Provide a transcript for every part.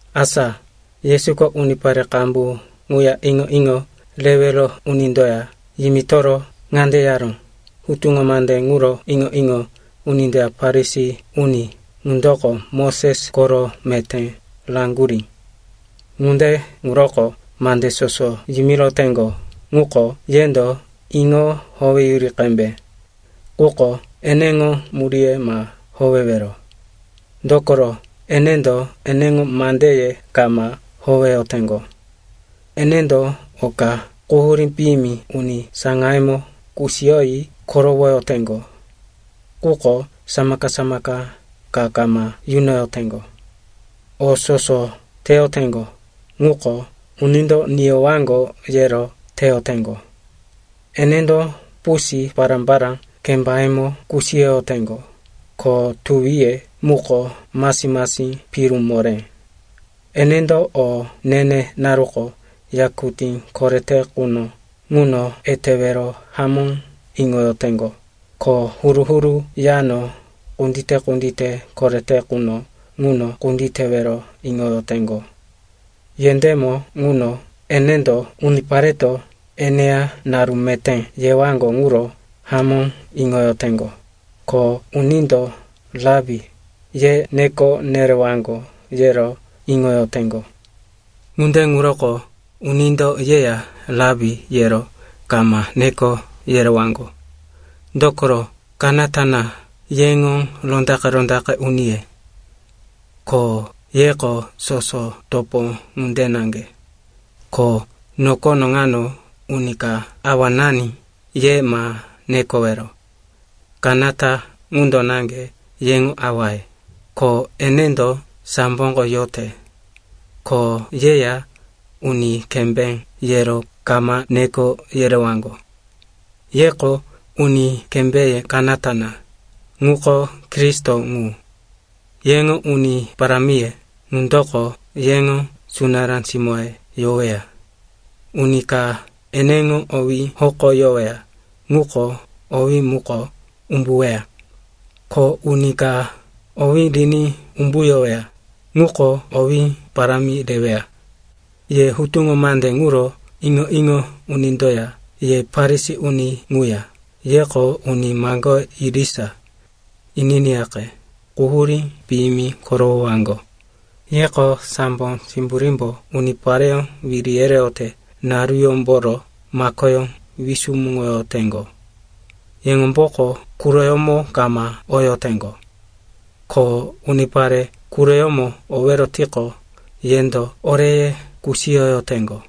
Asa Yesuko unipare qambu ŋuya iŋo-iŋo rewero unindoya yimitoro ŋande yaró, “Hutuŋo mande ŋuro iŋo-iŋo unindoya Farisi uni ŋundoko Moses koro meté raŋgurí. Ŋunde ŋuroko mande soso yimiroteŋgo ŋuko yendo iŋo howeyuri qembe. Quko eneŋo muríye ma howewero. Dokoro enendo eneŋo mandeye kama howeyoteŋgo. Enendo oka quhurí piyimi uni saŋayemo kusiyoyi korowoyoteŋgo. Quko samaka-samaka ka kama yunoyoteŋgo. “O soso teyoteŋgo ŋuko, unindo niyowaŋgo yero teyoteŋgo. Enendo pusi pará-pará kembayemo kusiyoyoteŋgo, ko tuwiye muko masi-masi piru moré. Enendo o ne-ne naruko yakutí korete quno ŋuno etewero hamó iŋoyoteŋgo, ko huru-huru yano kundite-kundite korete quno ŋuno kunditewero iŋoyoteŋgo. Yendémo ŋuno enendo unipareto eneya naru meté yewaŋgo ŋuro hamó iŋoyoteŋgo, ko unindo, ‘Rapi,’ ye neko nerewaŋgo, yero iŋoyoteŋgo. “Ŋunde ŋuroko unindo yeya, ‘Rapi,’ yero kama neko yerewaŋgo. Dokoro kanata na yeŋo rondaqe-rondaqe uniye, ko yeko soso topo ŋunde naŋge. Ko nokono ŋano uni ka ‘Awanani’ ye ma nekowero. Kanata ŋundo naŋge yeŋo awaye, ko enendo samboko yote. Ko yeya, ‘Uni Kembé,’ yero kama neko yerewaŋgo. Yeko uni kembéye kanata na, ŋuko Kristo ŋu. Yeŋo uni parámiye ŋundoko yeŋo sunará simóye yoweya. Uni ka eneŋo owí hokoyoweya, ŋuko owí muko umbuweya. Ko uni ka owí riní umbuyoweya, ŋuko owí parámi reweya. “Ye hutuŋo mande ŋuro iŋo-iŋo unindoya ye Farisi uni ŋuya, yeko uni maŋgoye irisa. Ininiyaqe, quhurí piyimi korowowaŋgo. Yeko sambo simburímbo unipareyó wiri yereyote naruyómboro makoyó wisumuŋoyoteŋgo. Yeŋomboko quroyómo kama oyoteŋgo. Ko unipare quroyómo owero tiqo, yendo oreye kusiyoyoteŋgo.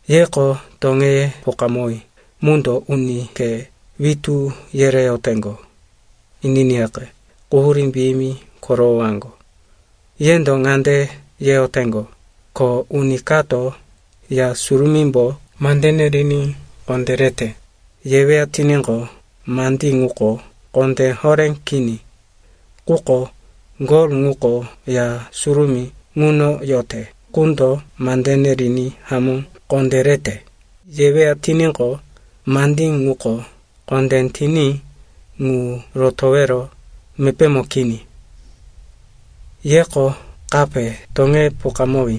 “Yeko toŋeye pokamowí mundo uni khe witú yereyoteŋgo. Ininiyaqe, quhurí piyimi korowowaŋgo. Yendo ŋande yeyoteŋgo, ‘Ko uni kato, “Ya Surumímbo mandene riní kondérete,” yeweya tiníqo, mandí ŋuko kondé horé kini. Quko, “Gol ŋuko Ya Surumí ŋuno yote qundo mandene riní hamó kondérete,” yeweya tiníqo, mandí ŋuko kondé tiní ŋu rotowero mepémo kini.’ Yeko kape toŋeye pokamowí.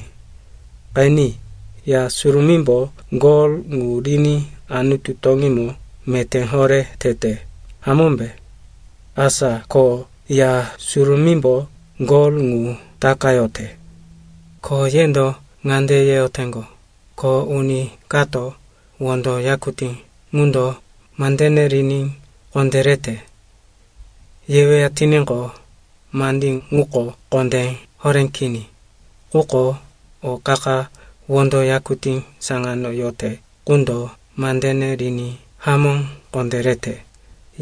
Qeni, Ya Surumímbo gol ŋu riní Anutu toŋímo meté horé tete, hamómbe? Asa ko Ya Surumímbo gol ŋu takayote. “Ko yendo ŋande yeyoteŋgo, ‘Ko uni kato, “Wondo yakutí ŋundo mandene riní kondérete,” yeweya tiníqo, mandí ŋuko kondé horé kini. Quko, “O qa-qa wondo yakutí saŋano yote qundo mandene riní hamó kondérete,”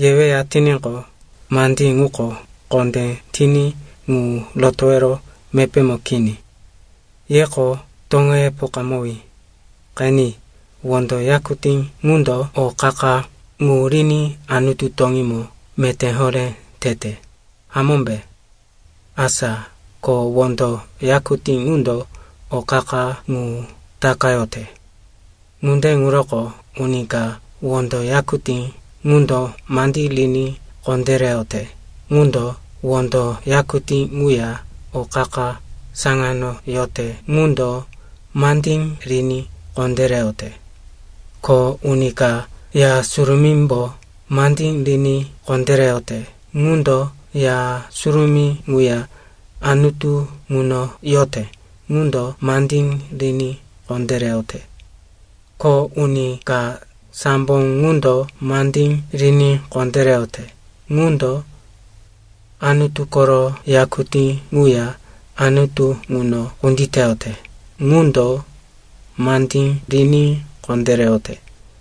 yeweya tiníqo, mandí ŋuko kondé tiní ŋu rotowero mepémo kini.’ Yeko toŋeye pokamowí. Qeni, wondo yakutí ŋundo o qa-qa ŋu riní Anutu toŋímo meté horé tete, hamómbe? Asa ko wondo yakutí ŋundo o qa-qa ŋu takayote. Ŋunde ŋuroko uni ka wondo yakutí ŋundo mandí riní kondéreyote ŋundo wondo yakutí ŋuya o qa-qa saŋano yote ŋundo mandí riní kondéreyote. Ko uni ka Ya Surumímbo mandí riní kondéreyote ŋundo Ya Surumí ŋuya Anutu ŋuno yote ŋundo mandí riní kondéreyote. Ko uni ka sambo ŋundo mandí riní kondéreyote ŋundo Anutu koro yakutí ŋuya Anutu ŋuno kunditeyote ŋundo mandí riní kondéreyote.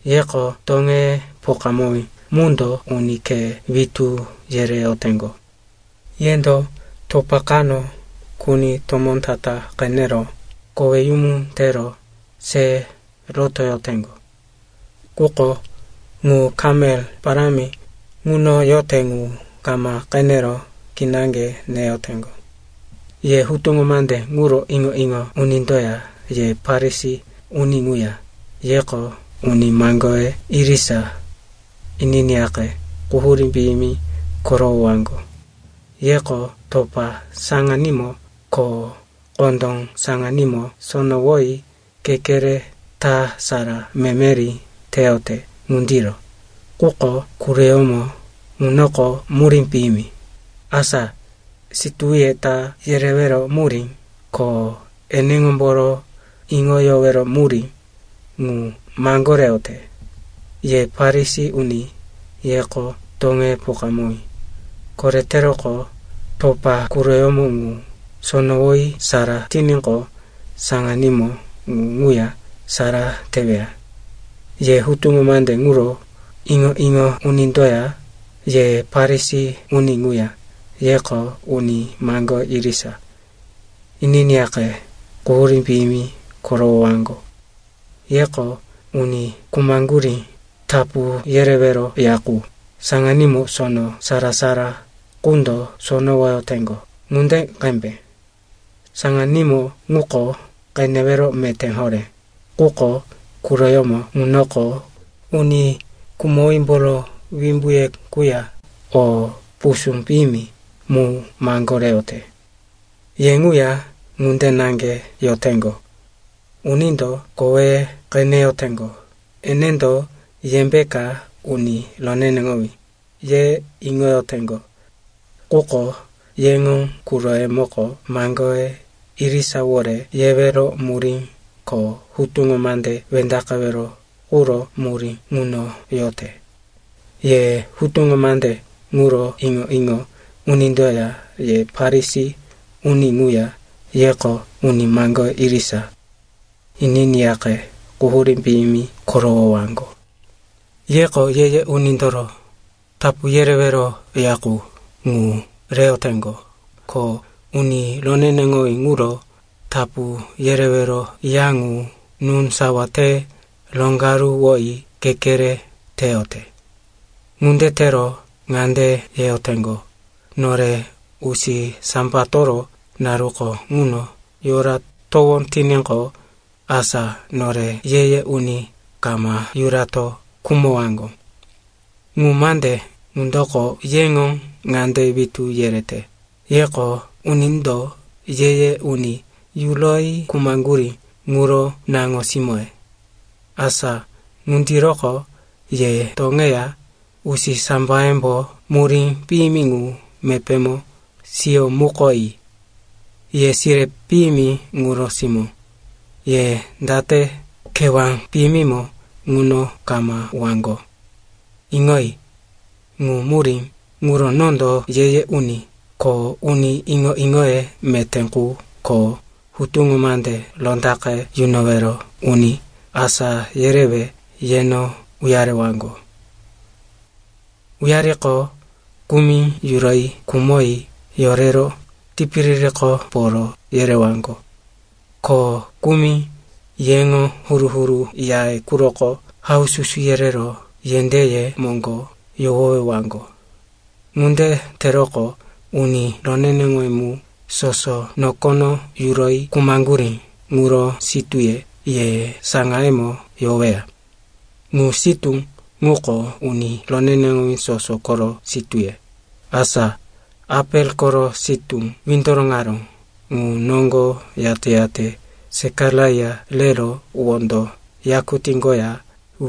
Yeko toŋeye pokamowí mundo uni khe witú yereyoteŋgo. Yendo topa kano kuni tomó ta-ta qenero koweyumu tero se rotoyoteŋgo. Quko ŋu kamel parámi ŋuno yote ŋu kama qenero kinaŋge neyoteŋgo. “Ye hutuŋo mande ŋuro iŋo-iŋo unindoya ye Farisi uni ŋuya, yeko uni maŋgoye irisa. Ininiyaqe, quhurí piyimi korowowaŋgo. Yeko topa saŋanímo ko kondó saŋanímo sonowoyi kekere ta sara memeri teyote ŋundiro. Quko quroyómo ŋunoko murí piyimi, asa situwiye ta yerewero murí ko eneŋomboro iŋoyowero murí, ŋu maŋgoreyote. Ye Farisi uni, yeko toŋeye pokamowí. Koreteroqo, topa quroyómo ŋu sonowoyi sara tiníqo, saŋanímo ŋu ŋuya sara teweya. “Ye hutuŋo mande ŋuro iŋo-iŋo unindoya ye Farisi uni ŋuya, yeko uni maŋgoye irisa. Ininiyaqe, quhurí piyimi korowowaŋgo. Yeko uni khumaŋgurí tapu yerewero ya qu saŋanímo sono sara-sara qundo sonowoyoteŋgo ŋunde qembe. Saŋanímo ŋuko qenewero meté horé, quko quroyómo ŋunoko uni khumowímboro wimbuye quya o pusú piyimi mu maŋgoreyote. Ye ŋuya ŋunde naŋge yoteŋgo. Unindo koweye qeneyoteŋgo, enendo yembeka uni roneneŋowí, ye iŋoyoteŋgo. Quko yeŋo quroyemoko maŋgoye irisawore yewero murí ko hutuŋo mande wendaqewero quro murí ŋuno yote. “Ye hutuŋo mande ŋuro iŋo-iŋo unindoya ye Farisi uni ŋuya, yeko uni maŋgoye irisa. Ininiyaqe, quhurí piyimi korowowaŋgo. Yeko ye-ye unindoro tapu yerewero ya qu ŋu reyoteŋgo, ko uni roneneŋowí ŋuro tapu yerewero ya ŋu núsawa te roŋgaruwoyi kekere teyote. Ŋunde tero ŋande yeyoteŋgo, ‘Nore usisambatoro naruko ŋuno yoratowó tiníqo, asa nore ye-ye uni kama yurato khumowaŋgo.’ Ŋu mande ŋundoko yeŋo ŋande witú yerete, yeko unindo ye-ye uni yuroyi khumaŋgurí ŋuro naŋo-simóye. Asa ŋundiroko ye toŋeya usisambayembo murí piyimi ŋu mepémo siyomukoyi. “Ye sire piyimi ŋuro simó. Ye date kewá piyimimo ŋuno kama uwaŋgo? Iŋoyi. Ŋu murí ŋuro nondo ye-ye uni ko uni iŋo-iŋoye meté qu ko hutuŋo mande rondaqe yunowero uni asá yerewe yeno uyarewaŋgo. Uyariqo, kumi yuroyi khumoyi yorero tipiririko poro yerewaŋgo. Ko kumi yeŋo huru-huru yaye quroko haususu yerero yendéye moŋgo yohowewaŋgo. Ŋunde teroqo, uni roneneŋowí mu soso nokono yuroyi khumaŋgurí ŋuro sitúye ye saŋayemo yoweya. Ŋu sitú ŋuko uni roneneŋowí soso koro sitúye, asa Apel koro sitú windoroŋaró ŋu noŋgo yate-yate Sekaraia rero wondo yakutí koya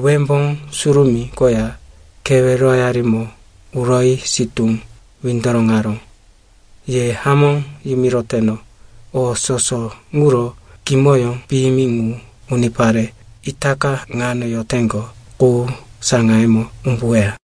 Wembó Surumí koya keweroyarimo uroyi sitú windoroŋaró. Ye hamó yimiroteno, o soso ŋuro kimoyó piyimi ŋu unipare itaka ŋano yoteŋgo qu saŋayemo umbuweya.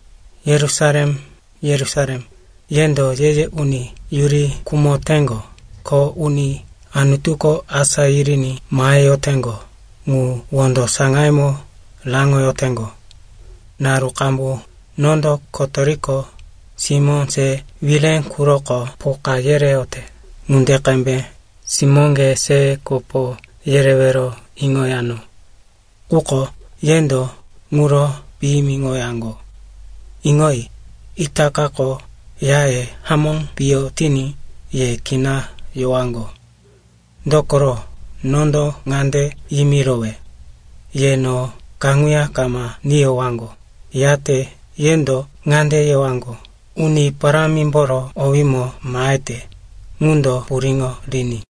“Yerusalem, Yerusalem, yendo ye-ye uni yuri khumoteŋgo, ko uni Anutuko asá yiriní maheyoteŋgo ŋu wondo saŋayemo raŋoyoteŋgo. Naru qambu nondo kotoriko simó se wire quroko poka yereyote ŋunde qembe simóŋge se kopo yerewero iŋoyano. Quko yendo ŋuro piyimiŋoyaŋgo. Iŋoyi, itakako yaye hamó piyo tiní ye kina yowaŋgo. Dokoro, nondo ŋande yimirowe, ye no kaŋuya kama niyowaŋgo, yate yendo ŋande yewaŋgo, ‘Uni Parámimboro owímo mahete ŋundo puriŋo riní!’”